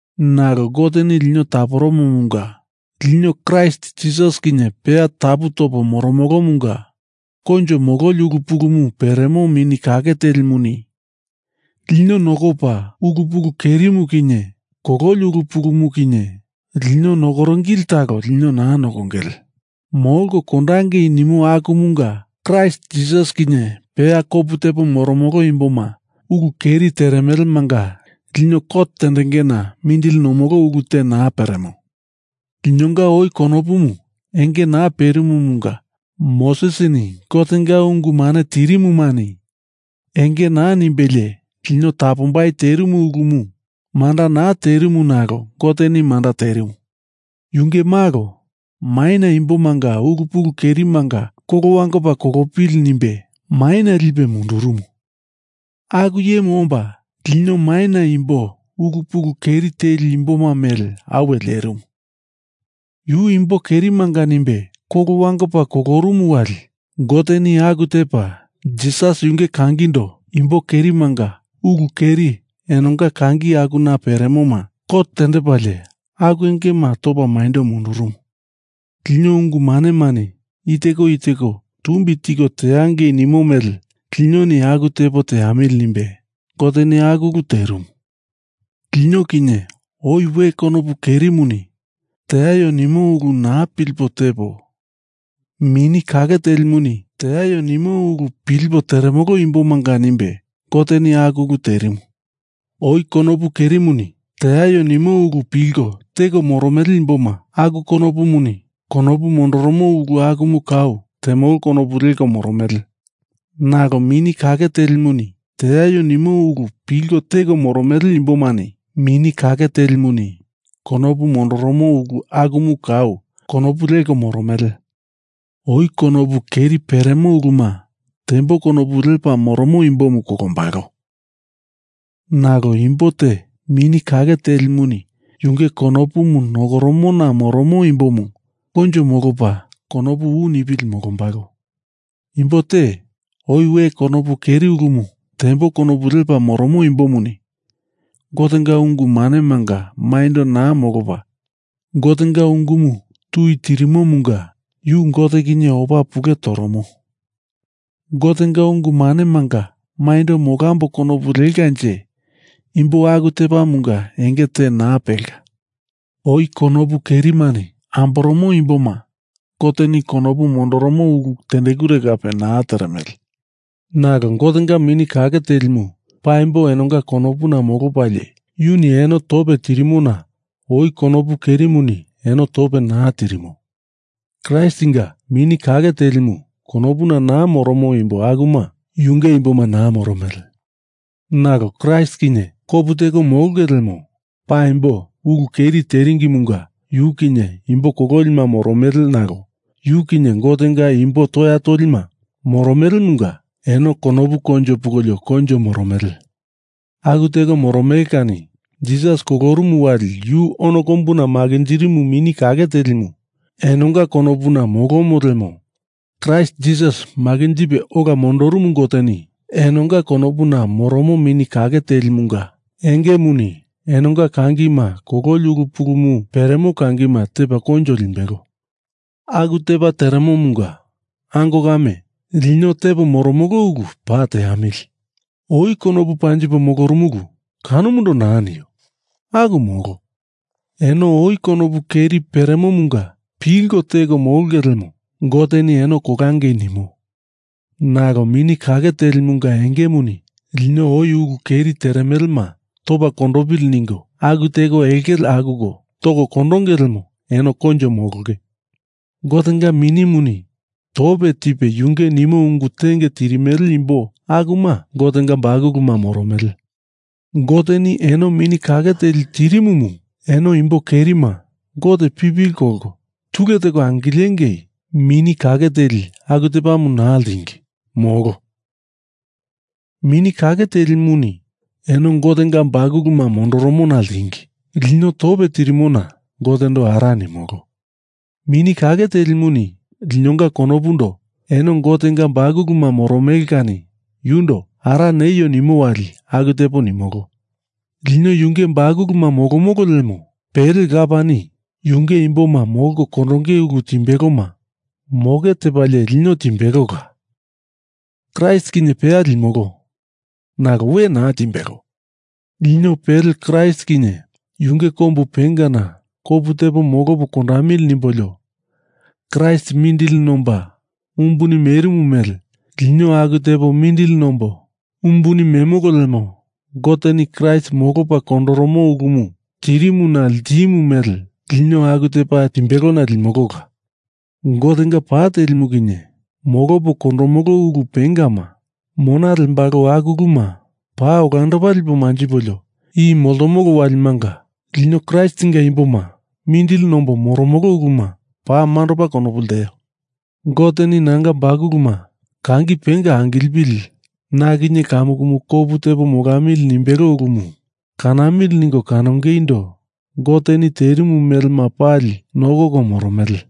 Nalo Goteni lino taporumumunga lino Kraist Jisas kinye peya tapu topo moromolomunga koinjo mololi ulu pulumu peremo Mini Kake Telimuni lino nokopa, ulu pulu kerimu kinye kololi ulu pulumu kinye lino nokoringili talo lino naa nokongele, molko kondangei nimo akumunga Kraist Jisas kinye peya kopu tepo moromolo imboma ulu keri teremelemanga lino kot tendengena mindili nomolo ulu te naa peremo. Linonga oi konopumu enge naa perimumunga Mosesini Gotenga ungu mane tirimumani enge naa nimbelie lino tapombai terimu ulumu manda naa terimu nalo Goteni manda terimu. Yunge Malo maina imbomanga ulu pulu kerimanga kolo wangopa kolopili nimbe maina lipe mundurumu, aku iyemu omba lino maina imbo ulu pulu keri teli imboma mele apuwe lierimu. Yu imbo kerimanga nimbe kolo wangopa kolorumu wali Goteni aku tepa Jisas yunge kangindo imbo kerimanga ulu keri enonga kangi akuna peremoma kot tendepalie aku engema topa maindo mundurumu. Lino ungu manemani i teko i teko tumbi tiko teangei nimo mele linoni aku tepo teamili nimbe Goteni aku ulu terimu. Lino kinye oi we konopu kerimuni teaio nimo ulu naa pilipo tepo Mini Kake Telimuni teaio nimo ulu pilipo teremolo imbomanga nimbe Goteni aku ulu terimu. Oi konopu kerimuni teaio nimo ulu pilko teko moromele imboma aku konopumuni konopu mondoromo ulu akumu kau temolo konopu leko moromele, nalo Mini Kake Telimuni teaio nimo ulu pilko teko moromele imbomani Mini Kake Telimuni konopu mondoromo ulu akumu kau konopu leko moromele. Oi konopu keri peremo uluma tembo konopu lepa moromo imbomu kolombalo, nalo imbo te Mini Kake Telimuni yunge konopumu nokoromona moromo imbomu koinjo molopa konopu u nipili molombalo. Imbo te oi we konopu keri ulumu tembo konopu lepa moromo imbomuni Gotenga ungu manemanga maindo naa molopa Gotenga ungumu tui tirimomunga yu Gote kinye opa pule toromo. Gotenga ungu manemanga maindo molambo konopu lekanje imbo aku tepamunga enge te naa pelka. Oi konopu kerimani amboromo imboma Goteni konopu mondoromo ulu tendekure kape naa teremele. Nalo Gotenga Mini Kake Telimu paimbo enonga konopuna molopalie yuni eno tope tirimona oi konopu kerimuni eno tope naa tirimo. Kraistinga Mini Kake Telimu konopuna naa moromo imbo akuma yunge imboma naa moromele. Nalo Kraist kinye kopu teko molonge lemo paimbo ulu keri teringimunga yu kinye imbo kololima moromele nalo yu kinye Gotenga imbo toya tolima moromelemunga eno konopu koinjo pungolio koinjo moromele. Aku teko moromele kani Jisas kolorumu wali yu ono kombuna makinjirimu Mini Kake Telimu enonga konopuna molomo lemo Kraist Jisas makinjipe ola mondorumu Goteni enonga konopuna moromo Mini Kake Telimunga engemuni enonga kangima kololi ulu pulumu peremo kangima tepa koinjo limbelo. Aku tepa teremomunga, ango kame, lino tepo moromolo ulumu paa teamili. Oi konopu panjipo molorumulu kanomundo naa nio. Aku molo. Eno oi konopu keri peremomunga pilko teko molonge lemo Goteni eno kolangei nimo. Nalo Mini Kake Telimunga engemuni lino oi ulu keri teremelema topa kondopili ningo aku teko elkele akuko toko kondonge lemo eno koinjo molonge. Gotenga Minimuni tope tipe yunge nimo ungu tenge tirimele imbo akuma Gotenga bakuluma moromele. Goteni eno Mini Kake Teli tirimumu, eno imbo kerima Gote pipili kolko tule teko angilengei Mini Kake Teli aku tepamu naa ltingi. Molo. Mini Kake Telimuni eno Gotenga bakuluma mondoromona ltingi. Lino tope tirimona Gotendo Ara nimolo. Mini Kake Telimuni linonga konopundo eno Gotenga bakuluma moromele kani yundo ara neio nimo wali aku tepo nimolo. Lino yunge bakuluma molomolo lemo pele Lapani yunge imboma molko kondonge ulu timbeloma moke tepalie lino timbelola, Kraist kinye peya limolo. Nalo we naa timbelo. Lino pele Kraist kinye yunge kombu pengana kopu tepo molopo kondamili nimbolio Kraist mindili nomba umbuni merimu mele lino aku tepo mindili nombo umbuni memolo lemo Goteni Kraist molopa kondoromo ulumu tirimuna ltimu mele lino aku tepa timbelona limolola. Gotenga pa telimu kinye molopo kondomolo ulu pengama mona lembalo aku uluma paa olandopa lipo manjipolio i moltomolo walimanga lino Kraistinga imboma mindili nombo moromolo uluma paa mandopa konopu lteo. Goteni nanga bakuluma kangi penga angilepili na kinye kamukumu kopu tepo molamili nimbelo ulumu kanamili ningo kanongeindo Goteni terimu melema pali nokoko moromele.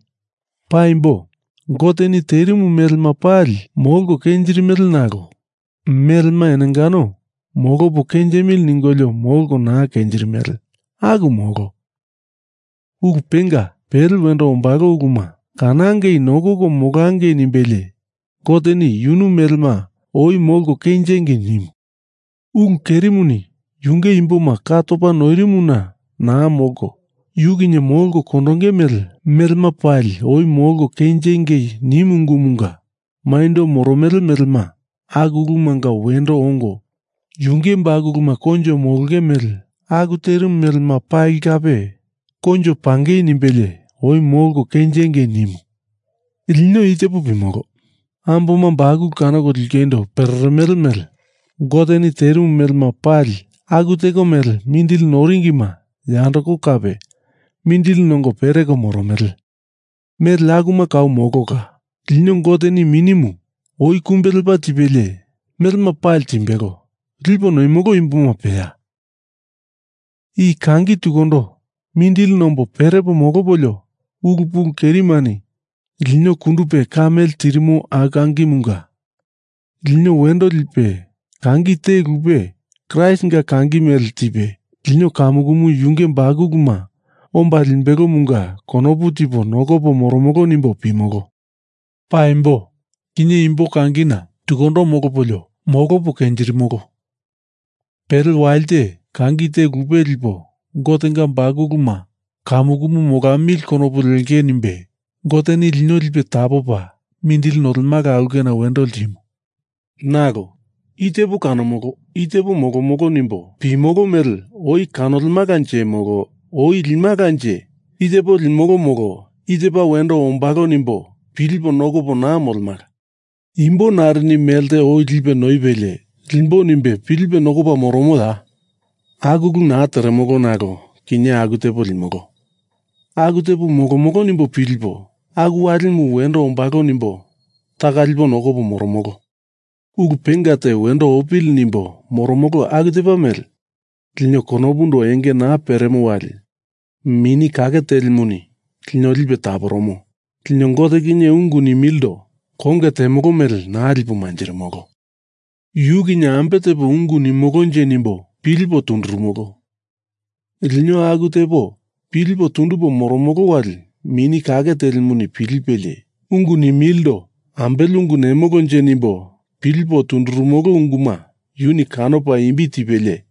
Paimbo, Goteni terimu melema pali molko kenjirimele, nalo melema enongano molopo kenjimili ningolio molko naa kenjirimele, aku molo. Ulu penga pele wendo ombalo uluma kanangei nokoko molangei nimbelie Goteni yunu melema oi molko kenjingei nimu. Ulu kerimuni yunge imboma ka topa noirimona naa molko yu kinye molko kondonge mele, melema pali oi molko kenjengei nimu ungumunga maindo moromele melema aku ulumunga wendo ongo yunge bakuluma koinjo molonge mele aku terimu melema pali kape koinjo pungei nimbelie oi molko kenjengei nimu. Lino i tepo pimolo: Amboma bakulu kanoko lingeindo mindili nongo pereremele mele Goteni terimu melema pali aku teko mele mindili noringima yandoko kape mindili nongo pereko moromele. Mele akuma kau molola. Lino Goteni Minimu oi kumbe lepa tipelie melema pali timbelo lipo noimolo imboma peya. I kangi tukundo mindili nombo perepo molopolio ulu pulu kerimani lino kundupe ka mele tirimo aku kangimunga lino wendo lipe kangi te lupe, Kraistinga kangi mele tipe lino kamukumu yunge bakuluma omba limbelomunga konopu tipo nokopo moromolo nimbo pimolo. Paimbo kinye imbo kangina tukundo molopolio molopo kenjirimolo. Pele walite kangi te lupe lipo Gotenga bakuluma kamukumu molamili konopu lengei nimbe Goteni lino lipe tapopa mindili nolemala aulkena wendo ltimu. Nalo i tepo kanomolo i tepo molomolo nimbo pimolo mele oi kanolemalanje molo oi limalanje, i tepo limolo molo i tepa wendo ombalo nimbo pilipo nokopo naa molemala. Imbo narini melte oi lipe noipelie limbo nimbe pilipe nokopa moromoya? Aku ulu naa teremolo nalo kinye aku tepo limolo, aku tepo molomolo nimbo pilipo aku walimu wendo ombalo nimbo taka lipo nokopo moromolo. Ulu penga te wendo opili nimbo moromolo aku tepa mele, lino konopundo enge naa peremo wali Mini Kake Telimuni lino lipe taporomo. Lino Gote kinye ungu nimilindo konge temolo mele naa lipo manjirimolo. Yu kinye ambe tepo ungu nimolonje nimbo, pilipo tundurumolo. Lino aku tepo pilipo tundupo moromolo wali Mini Kake Telimuni pilipelie ungu nimilindo ambele ungu nemolonje nimbo pilipo tundurumolo unguma yuni kanopa imbi tipelie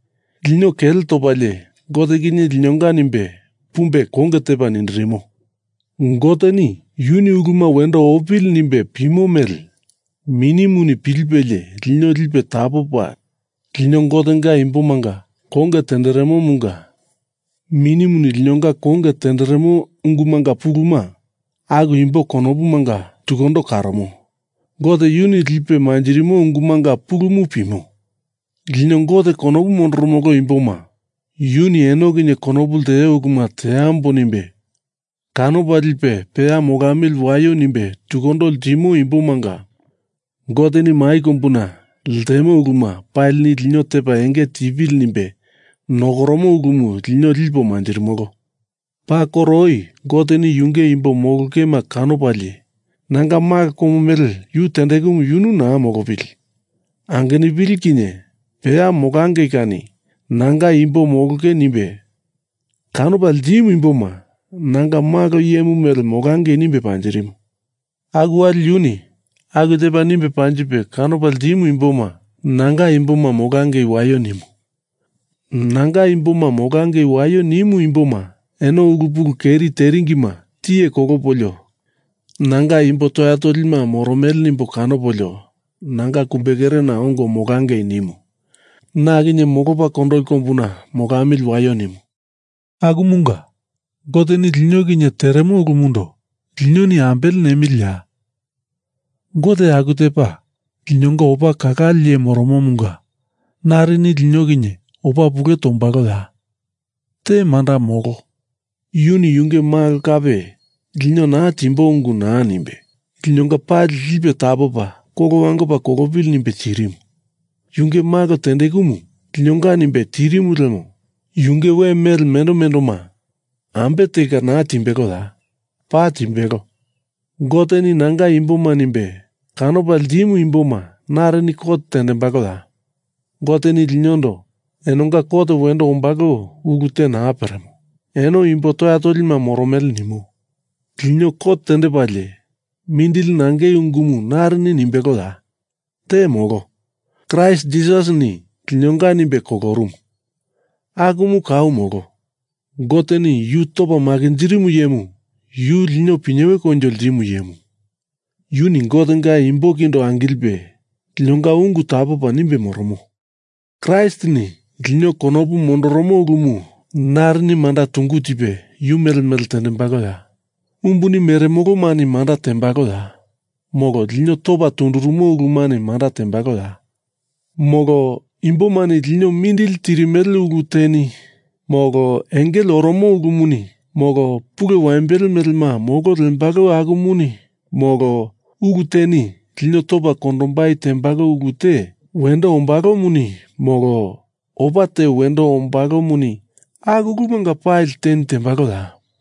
lino kele topalie Gote kinye linonga nimbe pumbe konge tepa nindirimo. Goteni yuni uluma wendo opili nimbe pimo mele Minimuni pilipelie lino lipe tapopa lino Gotenga imbomanga konge tenderemomunga Minimuni linonga konge tenderemo ungumanga puluma aku imbo konopumanga tukundo karomo Gote yuni lipe manjirimo ungumanga pulumu pimo. Lino Gote konopu mondoromolo imboma yuni eno kinye konopu lteo uluma teambo nimbe kanopa lipe peya molamili waio nimbe tukundo ltimo imbomanga Goteni mai kombuna ltemo uluma palini lino tepa enge tipili nimbe nokoromo ulumu lino lipo manjirimolo. Paa koro oi Goteni Yunge imbo molongema kanopalie nanga Malo komo mele yu tendekumu yunu naa molopili, angenupili kinye peya molangei kani nanga imbo molonge nimbe kanopa ltimu imboma nanga malo iyemu mele molangei nimbe panjirimu. Aku wali yuni aku tepa nimbe panjipe kanopa ltimu imboma nanga imboma molangei waio nimu. Nanga imboma molangei waio nimu imboma eno ulu pulu keri teringima tiye kolopolio nanga imbo toya tolima moromele nimbo kanopolio nanga kumbekerena ongo molangei nimu. Na kinye molopa kondoli kombuna molamili waio nimu. Akumunga Goteni lino kinye teremo ulumundo linoni ambele nemiliya? Gote aku tepa linonga opa kalale iye moromomunga narini lino kinye opa pule tombaloya? Te manda molo. Yuni yunge malo kape lino naa timbo ungu naa nimbe, linonga pali lipe tapopa kolo wangopa kolopili nimbe tirimu. Yunge malo tendekumu linonga nimbe tirimu lemo yunge we mele mendo mendoma ambe telka naa timbeloya? Paa timbelo. Goteni nanga imboma nimbe kanopa ltimu imboma narini kot tendembaloya? Goteni linondo enonga kot wendo ombalo ulu te naa peremo, eno imbo toya tolima moromele nimo. Lino kot tendepalie mindili nangei ungumu narini nimbeloya? Te molo. Kraist Jisasini linonga nimbe kolorumu. Akumu kau molo. Goteni yu topa makinjirimu iyemu, yu lino pinyewe koinjo ltimo iyemu, yuni Gotenga imbo kindo angilipe linonga ungu tapopa nimbe moromo. Kraistini lino konopu mondoromo ulumu narini manda tungu tipe yu mele mele tembaloya? Umbuni meremolomani manda tembaloya? Molo lino topa tundurumo ulumani manda tembaloya? Molo imbomani lino mindili tirimele ulu teni, molo engele oromo ulumuni, molo pulu waimbele melema molo lembalo akumuni, molo ulu teni lino topa kondombai tembalo ulu te wendo ombalomuni, molo opa te wendo ombalomuni, aku ulumanga pali teni tembaloya?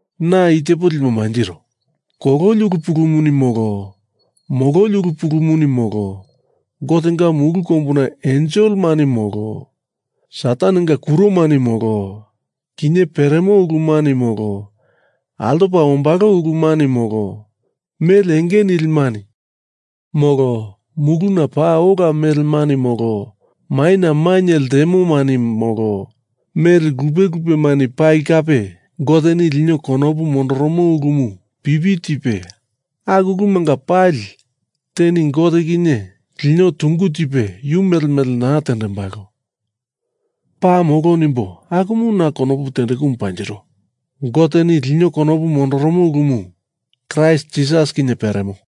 Na i tepo lipo manjiro. Kololi ulu pulumuni, molo mololi ulu pulumuni, molo Gotenga mulu kombuna enselemani, molo Satanenga kuromani, molo kinye peremo ulumani, molo altopa ombalo ulumani, molo mele enge nilimani, molo muluna paa ola melemani molo maina mainye ltemomani, molo mele lupe lupemani pali kape, Goteni lino konopu mondoromo ulumu pipi tipe aku ulumanga pali teni Gote kinye lino tungu tipe yu mele mele naa tembalo, paa molo nimbo akumu na konopu tendekumu panjiro. Goteni lino konopu mondoromo ulumu Kraist Jisas kinye peremo.